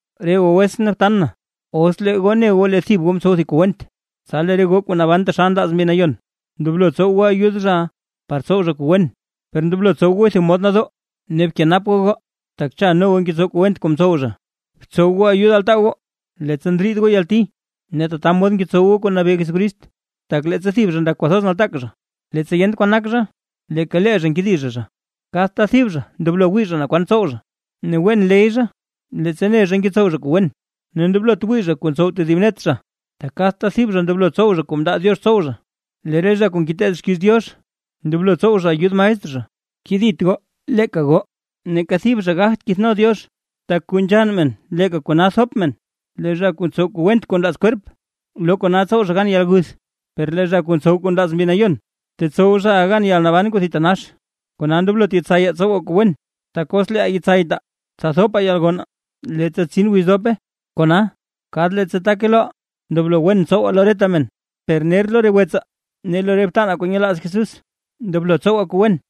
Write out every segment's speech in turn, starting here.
Re goo wetsʼn ne btan na, os lee goo ne goo lee thib goo mtsow thib kuu went, tsa lee re goo kuu naban taxal nlaaz Mbi Nayon, ndoblo tsow goo ayud zhaʼa, par tsow zha kuu wen; per ndoblo tsow gooy thib mod nadoo. Ne bkenap goo goo, tak cha no goo ngetsow kuu went kuu mtsow zha. Btsow goo ayud altaa goo, leettsa ndriid goo yalti, ne tata mod ngetsow goo kuu nabee Jesucrist. Tak leettsa lee thib zha ndak zha kwathoz nataak zha, leettsa yent kwan nak zha, leeka lee zha nkedi zha zha. Kadta thib zha ndoblo wii zha naa kwan ntsow zha, ne wen ley zha leettsa ne zha ngetsow zha kuu wen, ne ndoblot wii zha kuu ntsow tedib net zha. Tak kadta thib zha ndoblo tsow zha kuu mndaa Diox tsow zha. Lee re zha kuu ngeteed xkiiz Diox, ndoblo tsow zha ayud maestr zha. Kedit goo leeka goo, neeka thib zha gagt kithno Diox. Tak kuu nzhann men leeka kona thop men. Lee zha kuu ntsow kuu went kuu nlaaz kwerp, lo kona tsow zhaʼa gan yalguth. Per lee zha kuu ntsow kuu nlaaz Mbi Nayon, tetsow zhaʼa gan yalnaban kuu thitanax. Kona ndoblot yetsayaa tsowaa kuu wen, tak os leeʼaa yetsaytaa, tsa thopaa yalgonnaa, leettsa tsin wiz kuu dope. Kona, kadta leettsa take loʼaa, ndoblo wen tsowaa lo reta men, per ner lo re wetsaa ne lo re btanaa kuu nyelaaz Jesús ndoblo tsowaa kuu wen.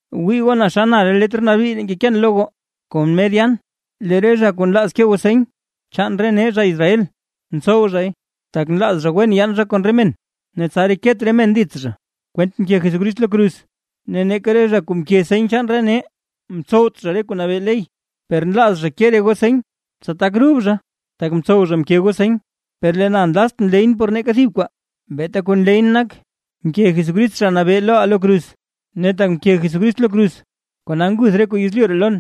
¡Wii goo naa xa na re letr nabii ree ngekeen loo goo kon mer yaan! Lee re zha kuu nlaaz ke goo seny chaan nee zha Israel, ntsow zhay, tak nlaaz zha wen yaan zha kon re men ne tsa reket re men dits zha, kwent mke Jesucrist lo kruz. Ne neeka re zha kuu mke seny chaan re nee ntsowt zha re kuu nabee ley. Per nlaaz zha ke re goo seny, tsa tak rub zha tak mtsow zha mke goo seny. Per lee na nlaztʼn leyʼn por neeka thib kwaa, beeta kuu nleyʼn nak mke Jesucrist Zha Nabee loʼaa lo kruz. Ne tak mke Jesucrist lo kruz, kona nguth re kuu yezlyu ree lon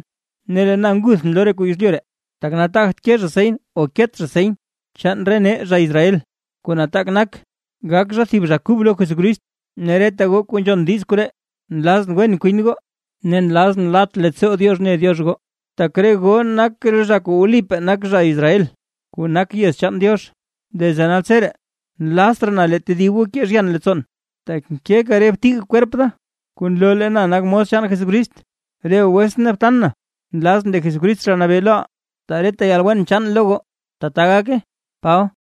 ne lee na nguthʼn lo re kuu yezlyu ree. Tak nataagt ke zha seny o ket zha seny chaan nee zha Israel, kuu nataak nak gak zha thib zha kub lo Jesucrist. Ne reta goo kuu nzhon diiz koree, nlazʼn wen kwin goo, ne nlazʼn lat leettsoo Diox ne Diox goo, tak re goo nak zha kuu wlipaa nak zha Israel kuu nak yez chaan Diox. Desde naltseree nlazt raa na lee tedib goo kee zhyan leettsoon, tak nkeka re btig kwerp da, kuu nloo lee na nakʼn mos chaan Jesucrist. Re goo wetsʼn ne btan na, nlazʼn lee Jesucrist Zha Nabee loʼaa, taa reta yalwen chaan lo goo. ¡Tbaa gake! Paba